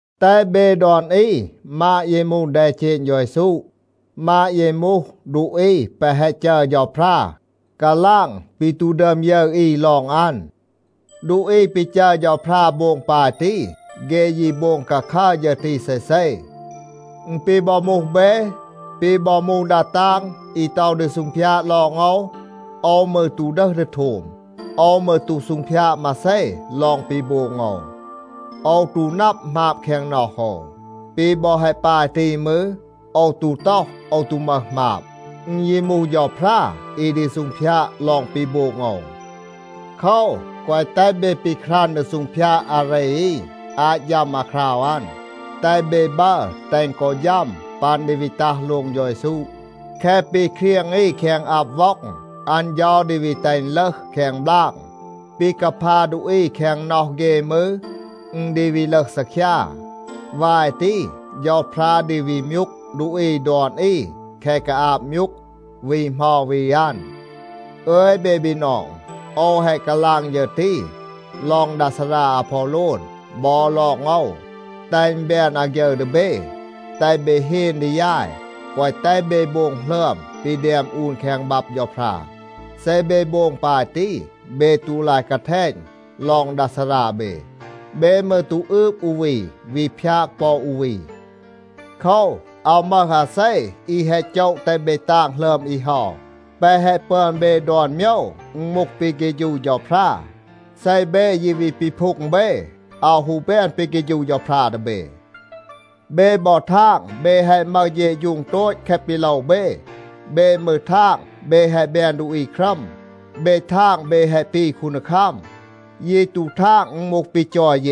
แตห เบ ดอน อี มาด เย มูห แดเจณ เฌา เยซู, มาด เย มูห ดูอี แปะ แฮะ จัร เฌาพรา กาลาง ปี ตู ดึอม ยึร อี ลอง อัน. ดูอี ปี จัร เฌาพรา โบง ปาย ตี, เฆ ยี โบง คาคัร ฌึร ตี เซเซ. อึณ ปี บอ มูห เบ, ปี บอ มูห ดา ตาง อี ต็อห ดี ซูงพยาด ลอง โอว, โอว มืร ตู ดึห ดี โทม. โอว มืร ตู ซูงพยาด มาเซ ลอง ปี โบง โอว. โอว ตู นับ หมาบ แคง น็อห โอว. ปี บอ แฮะ ปาย ตี มืร, โอว ตู ต็อห โอว ตู มึห หมาบ. อึณ ยี มูห เฌาพรา อี ดี ซูงพยาด ลอง ปี โบง โอว. โคว, แกวะ แตห เบ ปีครัน ดี ซูงพยาด อาเร อี อาต ฌัม อาคราว อัน. แตห เบ บัร แตห กอ ฌัม ปัน ดี วี ตัห โลง เฌา เยซู. แคะ ปี เครียง อี แคง อับ ว็อง, อัน เฌา ดี วี แตห อึณ ลึห แคง บลาง. ปี กาพา ดูอี แคง น็อห เฆ มืร, อึณ ดี วี ลึห ซีคยา. วาย ตี, เฌาพรา ดี วี มยูก ดูอี ดอน อี แคะ กาอาบ มยูก วี เหมา วี อัน. อึย เบ บีนอง, โอว แฮะ กาลาง ฌึร ตี ลอง ดา ซารา อาพอโลน บอ ลอง โอว, แตห อึณ แบน อาฆยึร ดี เบ. แตห เบ เฮน ดี ยาย, แกวะ แตห เบ โบง หลึอม ปี แดม อูน แคง บับ เฌาพรา. เซ เบ โบง ปาย ตี, เบ ตู ลาย กาแทณ ลอง ดา ซารา เบ. เบ มืร ตู อืบ อู วี, วี พยาก ปอ อู วี. โคว, อาว มึห อาเซ อี แฮะ โจะ แตห เบ ตาง หลึอม อี เฮา. แปะ แฮะ ปึอน เบ ดอน โมยว, อึณ มูห ปี เฆฌู เฌาพรา. เซ เบ ยี วี ปีพูง เบ, อาว ฮู แบน ปี เฆฌู เฌาพรา ดี เบ. เบ บอ ทาง เบ แฮะ มึห เฌะฌูง โตต แคะ ปี โลว เบ. เบ มืร ทาง เบ แฮะ แบน ดูอี ครัม. เบ ทาง เบ แฮะ ปี คูนดีคัม. ยี ตู ทาง อึณ มูห ปี จอย เย.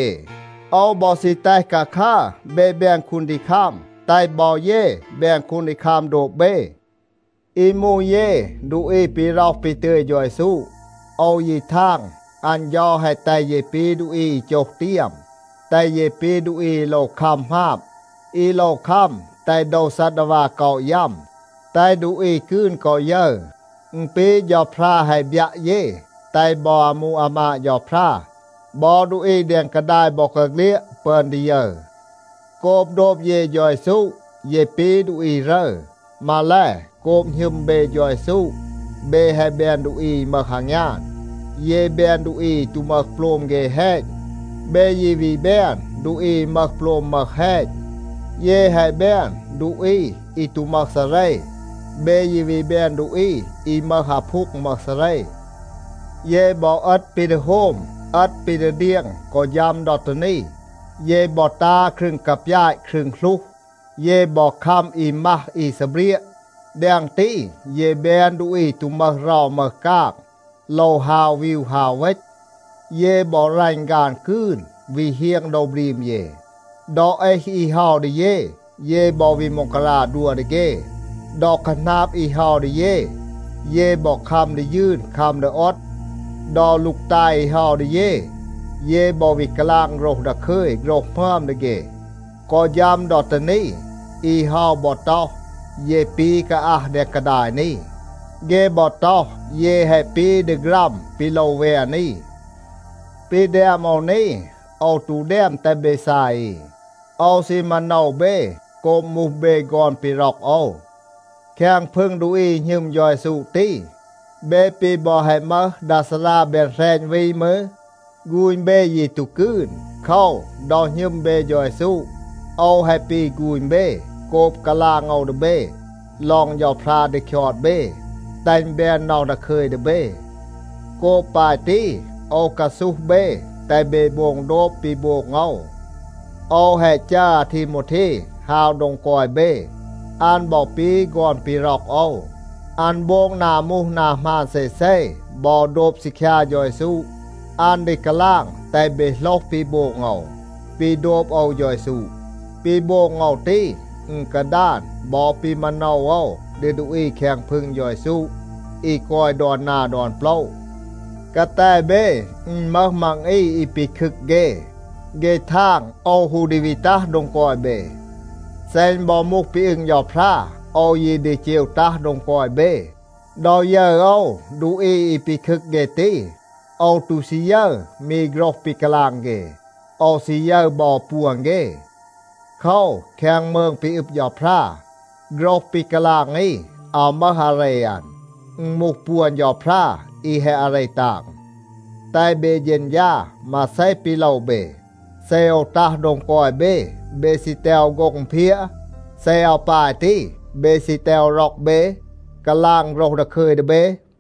โอว บอ ซี แตห คาคัร เบ แบน คูนดีคัม, แตห บอ เย แบน คูนดีคัม โดบ เบ. อี มูห เย ดูอี ปี ร็อห ปี ตึย เฌา เยซู, โอว ยี ทาง อัน เฌา แฮะ แตห เย ปี ดูอี อี โจห เตียม, แตห เย ปี ดูอี อี โลว คัม หมาบ, อี โลว คัม แตห โดว ซัดดาวา ก็อะ ยัม, แตห ดูอี กืน กอ ยึร. อึณ ปี เฌาพรา แฮะ บยัะ เย, แตห บอ อามู อามาด เฌาพรา บอ ดูอี แดง กาดาย บอกาเฆลียด ปึอน ดี ยึร. โกบ โดบ เย เฌา เยซู, เย ปี ดูอี รึร. มาแล, โกบ หณึม เบ เฌา เยซู, เบ แฮะ แบน ดูอี อี มึห อางยาน. เย แบน ดูอี อี ตู มึห โปลม เฆ แฮณ. เบ ยี วี แบน ดูอี อี มึห โปลม มึห แฮณ. เย แฮะ แบน ดูอี อี ตู มึห ซาเร. เบ ยี วี แบน ดูอี อี มึห อาพูง มึห ซาเร. เย บอ เอต ปี ดี โฮม, เอต ปี ดี เดียง กอ ฌัม ดอ ตี นี. เย บอ ตา ครึง กาปยาต ครึง หลูห. เย บอ คัม อี มัห อี ซีเบรียะ. แดง ตี, เย แบน ดูอี ตู มึห เรา มึห กาง, โลว ฮาว วีว ฮาว เวณ. เย บอ รัณ ฆาน กืน, วี เฮียง โดว บรีม เย. ดอ เอห อี เฮา ดี เย, เย บอ วี ม็องการา ดัว ดี เฆ. ดอ คาหนาบ อี เฮา ดี เย, เย บอ คัม ดี ยืน คัม ดี โอด. ดอ ลูกตาย อี เฮา ดี เย, เย บอ วี กาลาง โฆรห ดาคึย โฆรห หมึอม ดี เฆ. กอ ฌัม ดอ ตี นี, อี เฮา บอ ต็อห, เย ปี กาอัห แดง กาดาย นี. เฆ บอ ต็อห, เย แฮะ ปี ดีฆรัม ปี โลว แวน อี. ปี แดม โอว นี, โอว ตู แดม แตห เบ ซาย อี. โอว ซี มาโนว เบ โกบ มูห เบ ฆอน ปี ร็อก โอว. แคง พึง ดูอี อี หณึม เฌา เยซู ตี, เบ ปี บอ แฮะ มึห ดา ซารา แบน แหรณ วี มืร, ฆูณ เบ ยี ตู กืน. โคว, ดอ หณึม เบ เฌา เยซู, โอว แฮะ ปี ฆูณ เบ โกบ กาลาง โอว ดี เบ ลอง เฌาพรา ดี คยอด เบ, แตห อึณ แบน น็อห ดาคึย ดี เบ. โกบ ปาย ตี, โอว กาซูห เบ แตห เบ โบง โดบ ปี โบง โอว. โอว แฮะ จัร อาทีโมวเท ฮาว โดง กอย เบ. อัน บอ ปี ฆอน ปี ร็อก โอว. อัน โบง นา มูห นา หมาน เซเซ บอ โดบ ซีคยา เฌา เยซู. อัน ดี กาลาง แตห เบ โหลห ปี โบง โอว, ปี โดบ โอว เฌา เยซู. ปี โบง โอว ตี, อึณ กาดาน บอ ปี มาโนว โอว ดี ดูอี แคง พึง เฌา เยซู อี กอย ดอน นา ดอน โปละ. กาแต เบ อึณ มึห มัง อี อี ปีคึก เฆ. เฆ ทาง โอว ฮู ดี วี ตัห โดง กอย เบ. เซ อึณ บอ มูห ปี อึง เฌาพรา, โอว ยี ดี เจว ตัห โดง กอย เบ. ดอ ยึร โอว ดูอี อี ปีคึก เฆ ตี, โอว ตู ซี ยึร มี โฆรห ปี กาลาง เฆ. โอว ซี ยึร บอ ปวน เฆ. โคว, แคง มืง ปี อึบ เฌาพรา, โฆรห ปี กาลาง อี อาว มึห อาเร อัน. อึณ มูห ปวน เฌาพรา อี แฮะ อาเร ตาง. แตห เบ เฌณฌา มาเซ ปี โลว เบ. เซ โอว ตัห โดง กอย เบ, เบ ซี แตห โอว โฆ็ง อึณเพียะ? เซ อาว ปาย ตี, เบ ซี แตห โอว ร็อก เบ, กาลาง โฆรห ดาคึย ดี เบ?